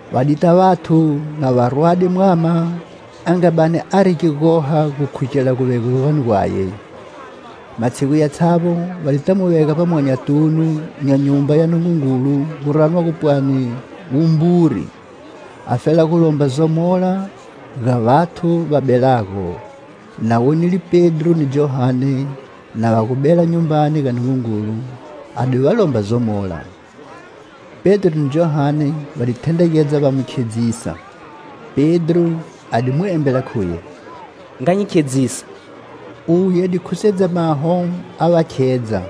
Va dita vathu na va rwade mwama a nga bani ari gigoha gukhugela guvelegwani gwaye. Matshigu yatshavbo va dita mu vega vbamwanyatunu nya Nyumba ya Nungungulu gu ranwago pwani "Wumburi," afela gulomba zomola ga vathu va belago. Na wonile Pedro ni Johane na va gu bela Nyumbani ga Nungungulu a di va lomba zomola. Pedro ni Johane va di thendregedza va mu khedzisa. Pedro a di mu embela khuye: "Nga hi khedzisa." Uye a di khusedza maho a va khedza,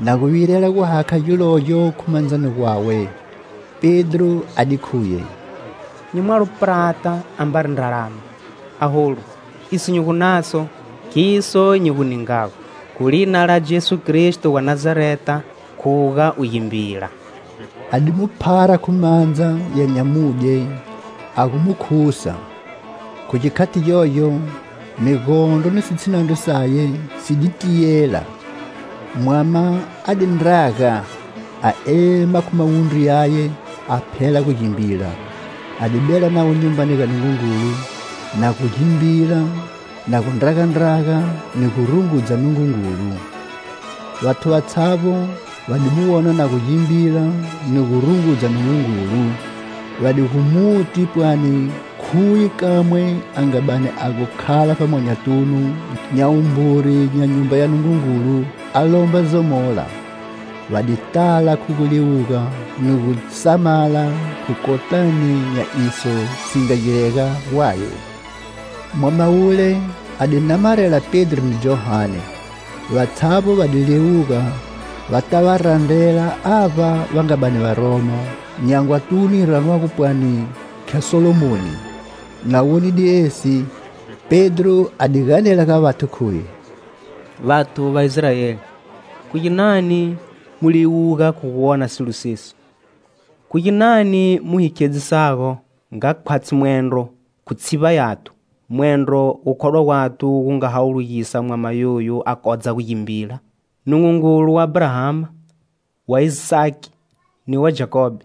na gu virela gu hakha gilogyo khu mandzani gwawe. Pedro a di khuye: "Nyi mwalo prata ambari ndralama; aholu, iso nyi gu naso, khiso nyi gu ningago: khu lina la Jesu Kristo wa Nazareta, khuga u gimbila." A di mu phara khu mandza ya nyamudye a gu mu khusa. Khu gikhati gyogyo, migondro ni sitshinandro saye, si di tiyela; mwama a di ndraga a ema khu mawundru yaye, a phela gu gimbila. A di bela navo Nyumbani ga Nungungulu, na gu gimbila, na gu ndragandraga ni gu rungudza Nungungulu. Vathu vatshavbo va di mu wona na gu gimbila ni gu rungudza Nungungulu, va di gu muti pwani khuye kamwe a nga bani a gu khala vbamwanyatunu nya wumburi nya Nyumba ya Nungungulu a lomba zomola. Va di tala khu guliwuga ni gusamala khu kotani nya iso si nga girega gwaye. Mwama wule a di namarela Pedro ni Johane, vatshavbo va di liwuga va ta va randrela avba va nga bani va romo, nyangwatunu yi ranwago pwani khya Salomoni. Na wonile esi, Pedro a di ganela ga vathu khuye: "Vathu va Israeli, khu ginani mu liwuga khu gu wona silo sesi; khu ginani mu hi khedzisago nga khwatshi mwendro khu tshivba yathu, mwendro gukhodwa gwathu gu nga hawulugisa mwama yoyu a kodza gu gimbila? Nungungulu wa Abrahama, wa Isaki ni wa Jakobe,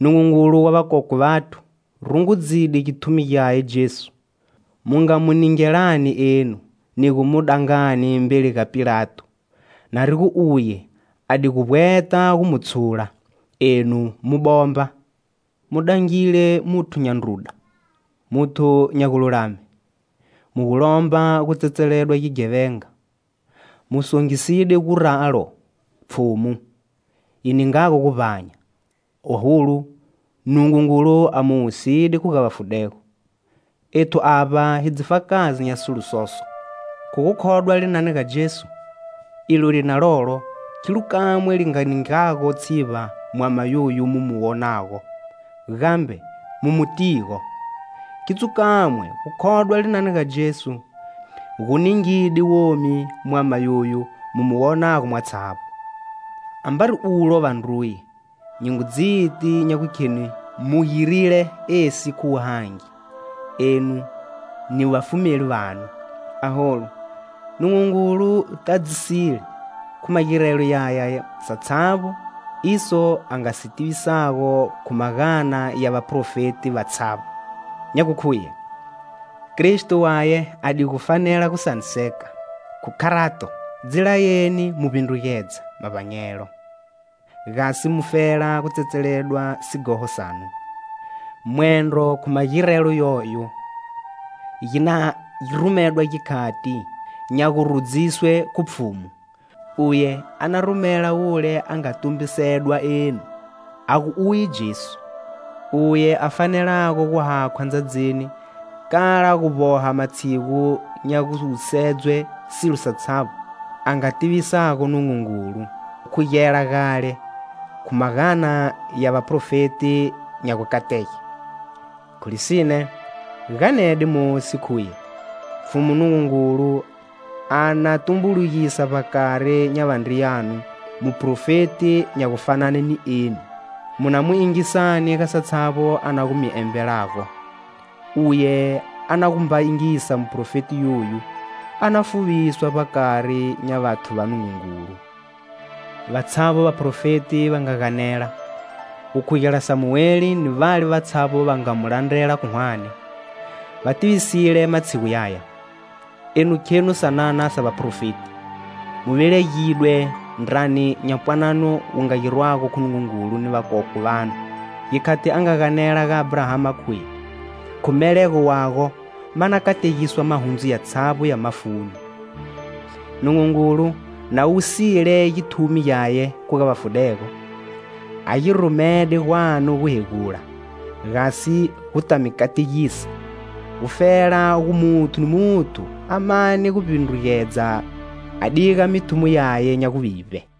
Nungungulu wa vakokwe vathu, rungudzide githumi gyaye Jesu, mu nga Mu ningelani enu, ni gu mu dangani mbeli ga Pilato; na ri gu uye a di gu vbweta gu mu tshula, enu mu bomba. Mu dangile muthu nya ndruda, muthu nya gululame, mu gu lomba gu tsetseledwa gighevenga. Mu songiside guralo Pfhumu yi ningago guvbanya. Aholu, Nungungulu a mu wusile khu ga vafudego; ethu avba hi dzifakazi nya sigiro soso. Khu gukhodwa linani ga Jesu, ilo lina lolo khilo kamwe li nga ningago tshivba mwama yoyu mu mu wonago, gambe mu mu tigo: khidzo kamwe, gukhodwa linani ga Jesu gu ningide womi mwama yoyo mu mu wonago mwatshavbo. Ambari ulo vandruye, nyi ngu dziti nya gukheni mu girile esi khu wuhangi, enu ni vafumeli vanu. Aholu, Nungungulu tadzisile khu magirelo yaya satshavbo iso a nga si tivisago khu magana ya vaprofeti vatshavbo, nya gu khuye: Kristo Waye a di gu fanela gusaniseka. Khu kharato, dzi layeni mu vbindrugedza mavbanyelo, gasi mufela gu tsetseledwa sighoho sanu; mwendro khu magirelo yoyo gi na rumedwa gikhati nya gu rudziswe khu Pfhumu. Uye a na rumela Wule a nga tumbisedwa enu, a gu uye Jesu. Uye a fanelago gu hakhwa ndzadzini kala gu vboha matshigu nya guwusedzwe silo satshavbo a nga tivisago Nungungulu gu khugela gale khu magana ya vaprofeti nya gukatege. Khu lisine, ganede Mosi khuye: 'Pfhumu Nungungulu a na tumbulugisa vbakari nya vandriyanu muprofeti nya gufanane ni eni. Mu na mu yingisani ga satshavbo a na gu mi embelago. Uye a na gu mba yingisa muprofeti yoyu a na fuviswa vbakari nya vathu va Nungungulu.' Vatshavbo vaprofeti va nga ganela, gu khugela Samueli ni vale vatshavbo va nga mu landrela khu hwane, va tivisile matshigu yaya. Enu khenu sanana sa vaprofeti, mu velegidwe ndrani nya pwanano wu nga girwago khu Nungungulu ni vakokwe vanu, gikhati a nga ganela ga Abrahama khuye: khu melego wago ma na kategiswa mahundzu yatshavbo ya mafuni. Nungungulu na wusile githumi gyaye khu ga vafudego, a gi rumede gwanu guhegula, gasi gu ta mi kategisa, gufela gu muthu ni muthu a mane gu vbindrugedza a diga mithumo yaye nya guvivbe."